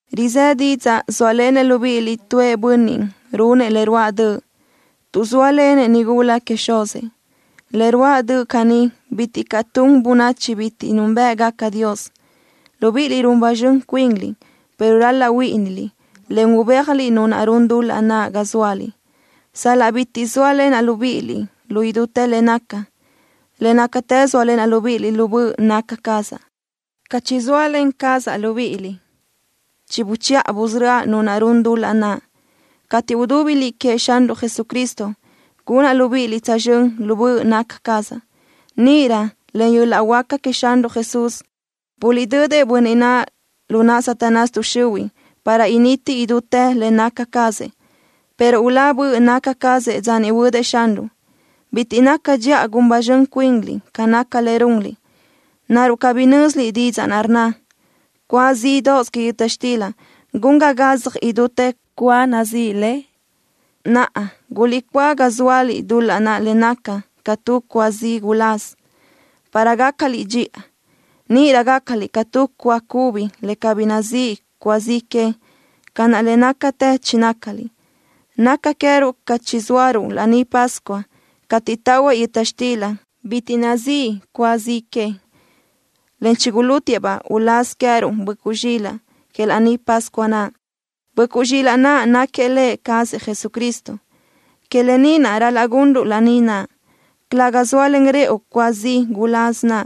Rizë́ didzaʼ zóalenëʼ libíʼiliʼ tuëʼ bönniʼ runëʼ le ruáʼ döʼ, tuʼ zóalenëʼ nigula queëʼ xuzëʼ. Le ruáʼ döʼ caní bitiʼ caʼ tun bönachi bitiʼ núnbëʼgaca Dios. Libíʼiliʼ run ba zxön cuinliʼ, pero ral-laʼ huíʼiniliʼ, en ubéajliʼ nu naʼ run dul-laʼ naʼ ga zóaliʼ. Sal-laʼ bitiʼ zóalenaʼ libíʼiliʼ lu idútë le nacaʼ, le nácatë zóalenaʼ libíʼiliʼ lu böʼ naca cazaʼ. Ca chizóalen cazaʼ libíʼiliʼ chibuchíʼa busörö́aʼ nu naʼ run dul-laʼ naʼ. Cateʼ udúbiliʼ queëʼ Xanruʼ Jesucristo gunaʼ libíʼiliʼ tsözxö́n lu böʼ naca cazaʼ. Níʼirö, len yöl-laʼ huáca queëʼ Xanruʼ Jesús buliʼdödëʼ bönniʼ naʼ lu naʼ Satanás tuʼ xihuiʼ para initi idútë le naca cazëʼ, pero ulá böʼ naca cazëʼ dza niʼ huödëʼ Xanruʼ. Bitiʼ naca dxiʼa gun ba zxön cuinliʼ ca naca le runliʼ. ¿Naruʼ cabí nö́ziliʼ didzaʼ naʼ rnna: “Cua zídoʼos que yöta xtila gun ga chazxaj idútë cúa nazíʼi le”? Naʼa, guliʼcúa ga zóaliʼ dul-laʼ naʼ le naca ca tu cúa zi gulás, para gácaliʼ dxiʼa. Níʼirö gácaliʼ ca tu cúa cubi le cabí nazíʼi cúa zi que, ca naʼ le nácatë chinácaliʼ. Naca queë́ruʼ ca chizóaruʼ Laní Pascua cateʼ tahuëʼ yöta xtila bitiʼ nazíʼ cúa zi que, en chigulútiëʼ-baʼ uláz queë́ruʼ böʼcuʼ zxilaʼ que Laní Pascua naʼ, böʼcuʼ zxilaʼ naʼ náquiëʼ Lë cazëʼ Cristo. Que lë ni naʼ ral-laʼ gunruʼ laní naʼ, calëga zóalen rëʼu cúa zi gulás naʼ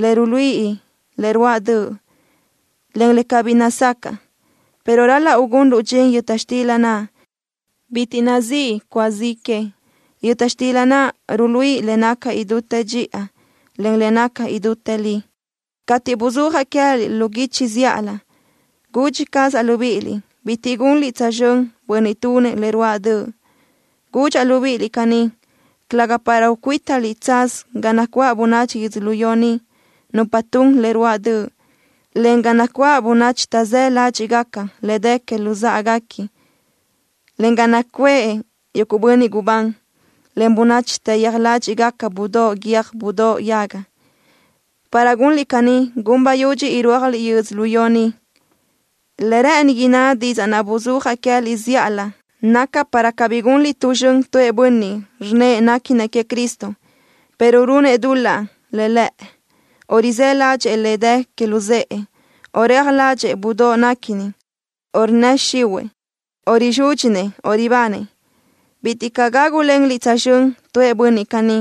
le ruluíʼi le ruáʼ döʼ, en le cabí nazacaʼ, pero ral-laʼ ugunruʼ dxin yöta xtila naʼ bitiʼ nazíʼi cúa zi que, yöta xtila naʼ ruluíʼi le naca idú dxiʼa, en le naca idútë li. Cateʼ buzúajaʼ queë́liʼ lu guichi zíʼalö, gudxi cazaʼ libíʼiliʼ bitiʼ gunliʼ tsözxö́n bönniʼ tunëʼ le ruáʼ döʼ. Gudxaʼ libíʼiliʼ caní, calëga para ucuítaliʼ tsaz ga nacuáʼ bönachi yödzölió ni, nupa tun le ruáʼ döʼ, en ga nacuáʼ bönachi taʼzë́ ládxiʼgaca le dë que luzë́ʼeguequi, en ga nacuʼë yuguʼ bönniʼ gubán, en bönachi taʼyéaj ládxiʼgaca budóʼ guiö́j budóʼ yaga. Para gunliʼ caní gun bayudxi irúajliʼ yödzölió ni. Le rë́ʼëni inná didzaʼ naʼ buzúajaʼ queë́liʼ zíʼalö naca para cabí gunliʼ tu zxön tuëʼ bönniʼ rnnëʼ néquinëʼ queëʼ Cristo, pero runëʼ dul-laʼ le lëʼe, o rizë́ ládxëʼë le dë que luzë́ʼë, o reaj ládxëʼë tu budóʼ néquini, o rinnë́ xihuëʼë, o rizúdxinëʼ, o ribanëʼ. Bitiʼ caʼ gágulenliʼ tsözxö́n tuëʼ bönniʼ caní.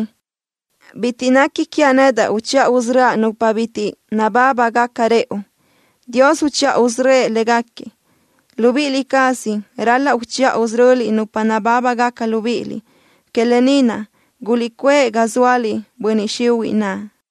Bitiʼ nequi quiaʼ nedaʼ uchiʼa usörö́aʼ nupa bitiʼ nabábagaca rëʼu. Dios uchiʼa usörö́ëʼ léguequi. Libíʼi cázaliʼ ral-laʼ uchiʼa usöröliʼ nupa nabábagaca libíʼiliʼ. Que lë ni naʼ, guliʼcúëʼ ga zóaliʼ bönniʼ xihuiʼ naʼ.